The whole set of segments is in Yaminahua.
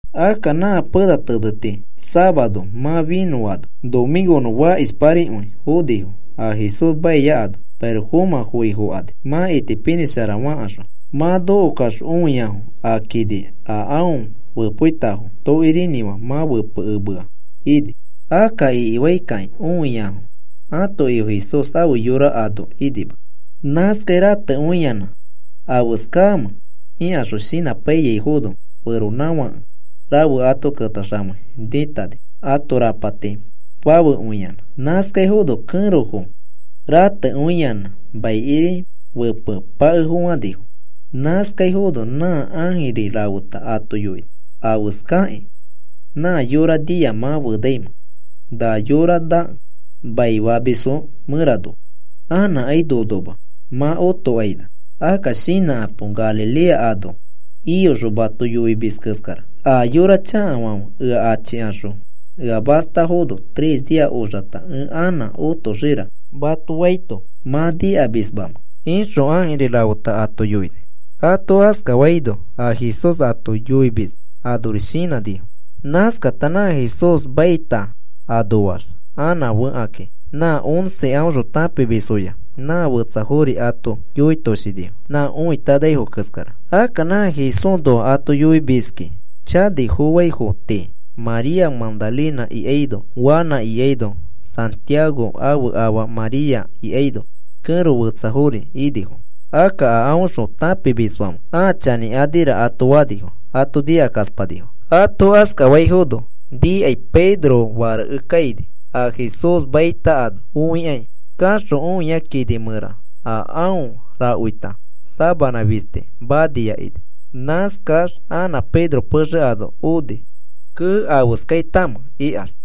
Akka nã pena teneti safaro mã finõfaano nomĩkonõ fakishparikõi fonifo a Jesús maia ano. Pirofomã foifokani mã itipinĩshara fakaxõ. Mã nokokaxõ õiafo a kini a aõ fepoitafo tokirinĩfã mã fepekemea ini. Akka ikifaikakĩ õiafo ãto Ifo Jesús ãfe yora ano inima. Nãskai ratekõiyanã afeskamẽ ikaxõ shinãpaiyaifono, feronãfake rafe ato ketaxamei nĩtani, ãto rapati fafekõiyanã. Nãskaifono kẽrofo ratekõiyanã maikiri fepepakefofãnifo. Nãskaifono nã ãjiri rafeta ato yoini: “¿Afeskakĩ nã yora nia mã fenaimẽ na yora nakẽ maifamisfo mẽranoa? Anãkai nonoma, mã otokaina. Akka shinãkapo a Galilea ano iyoxõ mato yoimis keskara. ‘¿A yora chakafãfe ea achikaxõ ea mastafono tres nia oxata ẽ anã otoxira,’ mato faito mã nikamismamẽ?” ixõ ãjiri rafeta ato yoini. Ato askafaino a Jesús ato yoimis anori shinãnifo. Nãskakata nã Jesús maita anoax anã fekakĩ, nã once aõxõ tãpimisfoya nã fetsafori ato yoitoshinifo nã õitanaifo keskara. Akka nã Jesúsnoa ato yoimiski chanifofãifo tii, María Magdalena ikaino Juana ikaino Santiago ãfe afa María ikaino kẽro fetsafori inifo. Akka a aõxõ tãpimisfãfe, “Ãa chanĩkanira,” ato fanifo. Ato nikakaspanifo. Ato askafaifono nikai Pedro fareke kaini, a Jesús maita ano õikai. Kaxõ õia kini mẽra a aõ rakoita sabanã fisti mania ini. Nãskax anã Pedro pexe ano oni, “Kee, ¿afeskaitamẽ?” ikax.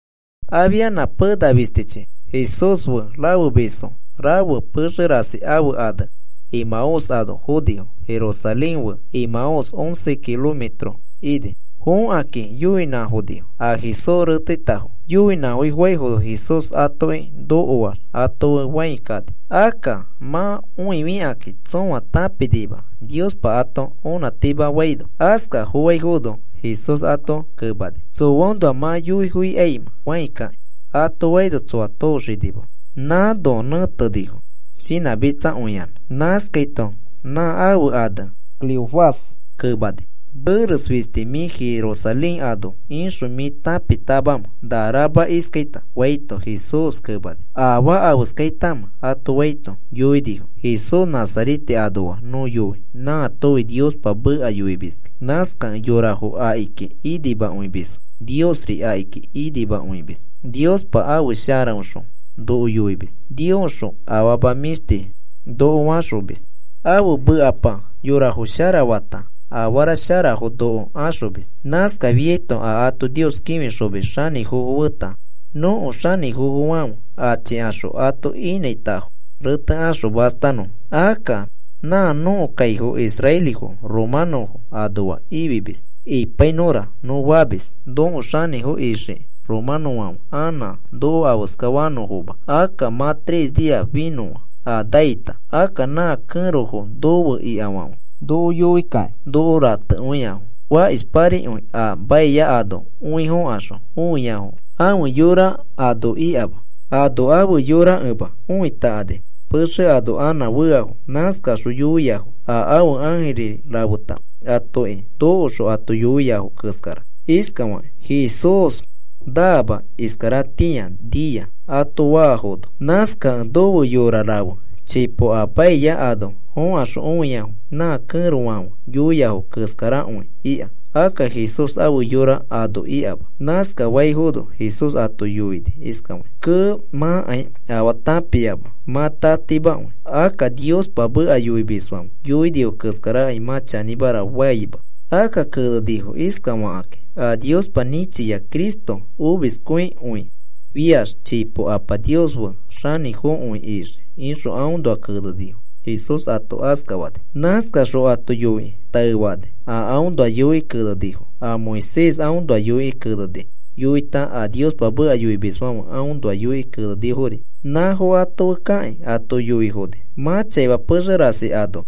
Afia pena fistichi Jesús fe rafemisfo rafe pexe rasi ãfe ane Emaús ano fonifo. Jerusalén fe Emaús once kilometro ini. Fokakĩ yoifonifo a Jesús reteitafo. Yoinãfofãifono Jesús atoki nokoax ato fe fãi kani. Akka mã õifikakĩ tsõa tãpinima, Niospa ato onãtimafaino. Askafofãifono Jesús ato kemani: “¿Tsoaõnoa mã yoifokaimẽ fãi kakĩ?” ato faino tsoa tooxinima nãno nẽtenifo shinãmitsakõiyanã. Nãskaito nã ãfe ane Cleofás kemani: “¿Meres fisti mĩ Jerusalén ano ixõ, mĩ tãpitamamẽ na rama iskaita?” faito, Jesús kemani: “¿Afaa afeskaitamẽ?” ato faito yoinifo: “Jesús Nazarete anoa nõ yoi, nãatofi Niospa meka yoimiskĩ. Nãskakẽ yorafo akiki inimakõimisfo, Niosri akiki inimakõimis. Niospa ãfe sharaõxõ noko yoimis Niosxõ afama mĩshti noko faxomis. Ãfe mekapa yorafo sharafata afara sharafo noko axomis. Nãskafiaito a ato Nios kĩfixomis xanĩfofo feta nõko xanĩfofofãfe achikaxõ ato inãitafo retekaxõ mastanõfo. Akka nã nõko kaifo israelifo romanõfo anoa ifimis ipainõra nõ famis nõko xanĩfo ixiki romanõfãfe anã noko afeskafanõfoma. Akka mã tres nia finõa a naita. Akka nã kẽrofo nofe ikafãfe noko yoikakĩ noko ratekõiafo. Fakishparikõi a maia ano õifokaxõ õiafo ãfe yora ano ikama. Ano ãfe yorakẽma õitakani pexe ano anã feafo. Nãskaxõ yoiafo a ãfe ãjiri rafeta atoki nokoxõ ato yoiafo keskara iskafakĩ: ‘Jesús naama, iskaratĩa nia,’ ato faafono. Nãskakẽ nofe yora rafe chipo a maia ano fokaxõ õiafo nã kẽrofãfe yoiafo keskarakõi ika. Akka Jesús ãfe yora ano ikama.” Nãskafaifono Jesús ato yoini iskafakĩ: “Kee, mãkai afaa tãpiama, mã tatimakõi. Akka a Niospa meka yoimisfãfe yoinifo keskarakai mã chanĩmara faima. Akka kenenifo iskafakĩ: ‘A Niospa nĩchia Cristo omiskõikõifiax, chipo Apa Nios fe xanĩfokõi ixii,’ ixõ aõnoa kenenifo,” Jesús ato askafani. Nãskaxõ ato yoikĩ taefani a aõnoa yoikĩ kenenifo, a Moisés aõnoa yoikĩ keneni yoita, a Niospa meka yoimisfãfe aõnoa yoikĩ kenenifori; nãfo ato fe kakĩ ato yoifoni. Mã chaima pexe rasi ano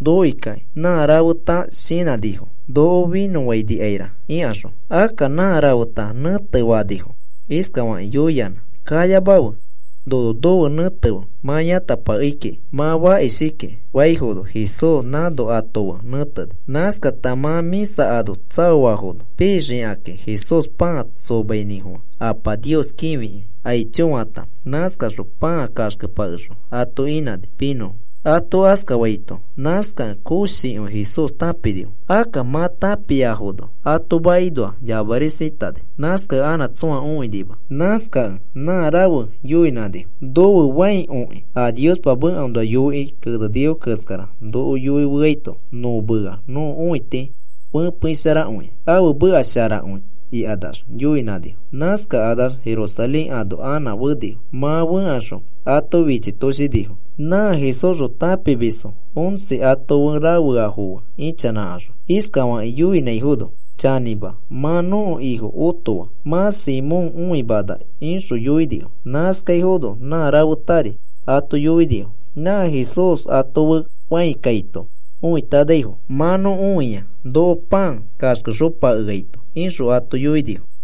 nokokakĩ nã rafeta shinãnifo: “Noko finõfainikaira,” ikaxõ. Akka nã rafeta nẽtefanifo iskafakĩ yoiyanã: “Kayamafe. Nono nofe nẽtefe mã yãtapakei kiki. Mã fakishaki,” faifono Jesús nãno ato fe nẽteni. Nãskata mã mĩsa ano tsaoafono pixakakĩ Jesús pãa tsomainĩfofã, Apa Nios kĩfikĩ. “Aicho,” fata, nãskaxõ pãa kaxkepakexõ ato inãni pinõfo. Ato askafaito nãskakẽ koshikõi Jesús tãpinifo. Akka mã tãpiafono ato makinoax yamarisatani. Nãskakẽ anã tsõa õinima. Nãskakẽ ãa rafe yoinãnifo: “No fe fãi okĩ a Niospa mekaõnoa yoikĩ kenenifo keskara noko yoifeaito nõ mea nõko õiti fepeisharakõia. Ãfe meka sharakõi,” ikanax yoinãnifo. Nãskakanax Jerusalén ano anã fenifo. Mã fẽkaxõ ato fichitoshinifo, nã Jesúsxõ tãpimisfo once a ato fe rafeafo fe ĩchanãkaxõ, iskafakĩ yoiaifono: “Chanĩma, mã nõko Ifo otoa, mã Simón õimana,” ixõ yoinifo. Nãskaifono nã rafetari ato yoinifo nã Jesús ato fe fãi kaito õitanaifo: “Mã nõ õia noko pãa torexopakeaito,” ixõ ato yoinifo.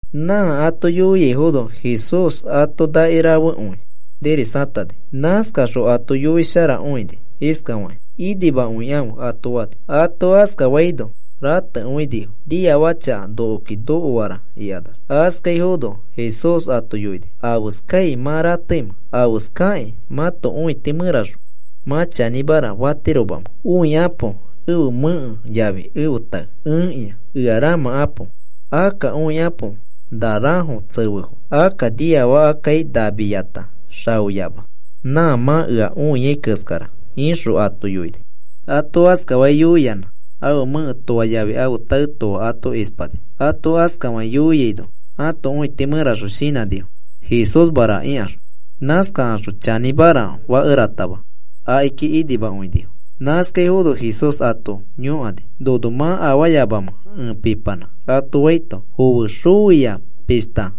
Nã ato yoiaifono, Jesús ato nakirafekõi nirisatani. Nãskaxõ ato yoisharakõini iskafakĩ: “Inimakõikãfe,” ato fani. Ato askafaino ratekõinifo, “Niafaka chaka nokoki nokoara,” ikanax. Askaifono Jesús ato yoini: “¿Afeskai mã rateimẽ? ¿Afeskakĩ mãto õiti mẽraxõ mã chanĩmara fatiromamẽ? Õikapo ẽfe mẽke yafi ẽfe tae. Ẽkĩa. Ea ramãkapo. Akka õikapo na rãfo tsefefo. Akka niafakakai namiyata xaoyama, nã mã ea õiai keskara,” ixõ ato yoini. Ato askafakĩ yoiyanã, ãfe mẽke toa yafi ãfe tae toa ato ispani. Ato askafakĩ yoiaino ãto õiti mẽraxõ shinãnifo: “Jesúsmara,” ikaxõ. Nãskaxõ chanĩmara fakeratama akiki inimakõinifo. Nãskaifono Jesús ato yõkani: “¿Nono mã afaayamamẽ ẽ pipanã?” ato faito, foe xoia pishta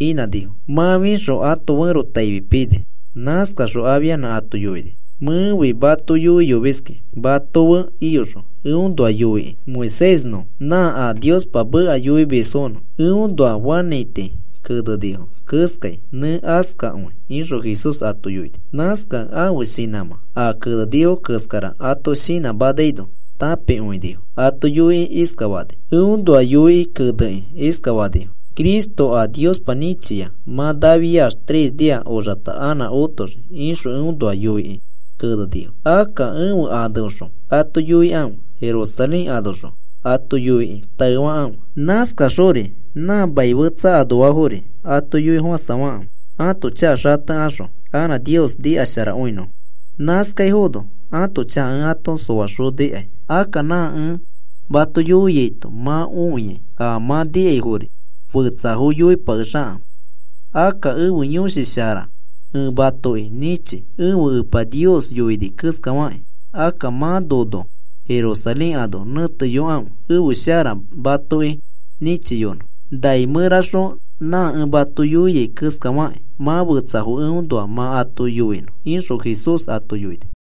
inãnifo. Mã fixõ ãto ferotaifi pini. Nãskaxõ afianã ato yoini: “Mẽfi mato yoiyomiskĩ mato fe iyoxõ eõnoa yoikĩ Moisésnõ nã a Niospa meka yoimisfonõ, eõnoa fanãiti kenenifo keskai nẽ askakõi,” ixõ Jesús ato yoini. Nãskakẽ ãfe shinãmã a kenenifo keskara ato shinãmanaino tãpikõinifo. Ato yoikĩ iskafani: “Eõnoa yoikĩ kenekĩ iskafanifo: ‘Cristo a Niospa nĩchia mã nafiax tres nia oxata anã otoxii,’ ixõ eõnoa yoikĩ kenenifo. Akka ẽfe aneõxõ ato yoikãfe. Jerusalén anoxõ ato yoikĩ taefakãfe. Nãskaxori nã maniafo tii anoafori ato yoifofãsafakãfe ãto chaka xatekaxõ anã Nios nikasharakõinõfo, nãskaifono ãto chaka ẽ ato soaxonikai. Akka nã ẽ mato yoiaito, mã õiai a mã nikaifori fetsafo yoipakexakãfe. Akka ẽfe Yõshi Shara ẽ matoki nĩchi ẽfe Epa yoiyoni keskafakĩ. Akka mã nono Jerusalén ano nẽteyokãfe, ẽfe shara matoki nĩchiyonõ nai mẽraxõ nã ẽ mato yoiai keskafakĩ mã fetsafo eõnoa mã ato yoinõ,” ixõ Jesús ato yoini.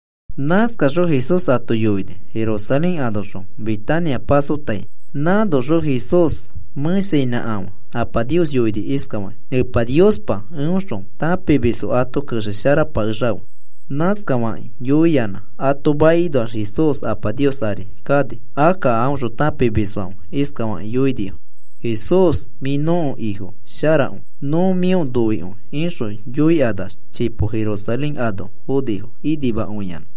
Nãskaxõ Jesús ato iyoni Jerusalén anoxõ Betania pasotai. Nãnoxõ Jesús mẽshainãkafã Apa Nios yoini iskafakĩ: “Epa Niospa, eõxõ tãpimisfo ato kexesharapakexafe.” Nãskafakĩ yoiyanã ato makinoax Jesús Apa Nios ari kani. Akka a aõxõ tãpimisfãfe iskafakĩ yoinifo: “Jesús, mĩ nõko Ifo sharakõi, nõ mĩo noikõi,” ixõ yoikanax chipo Jerusalén ano fonifo inimakõiyanã.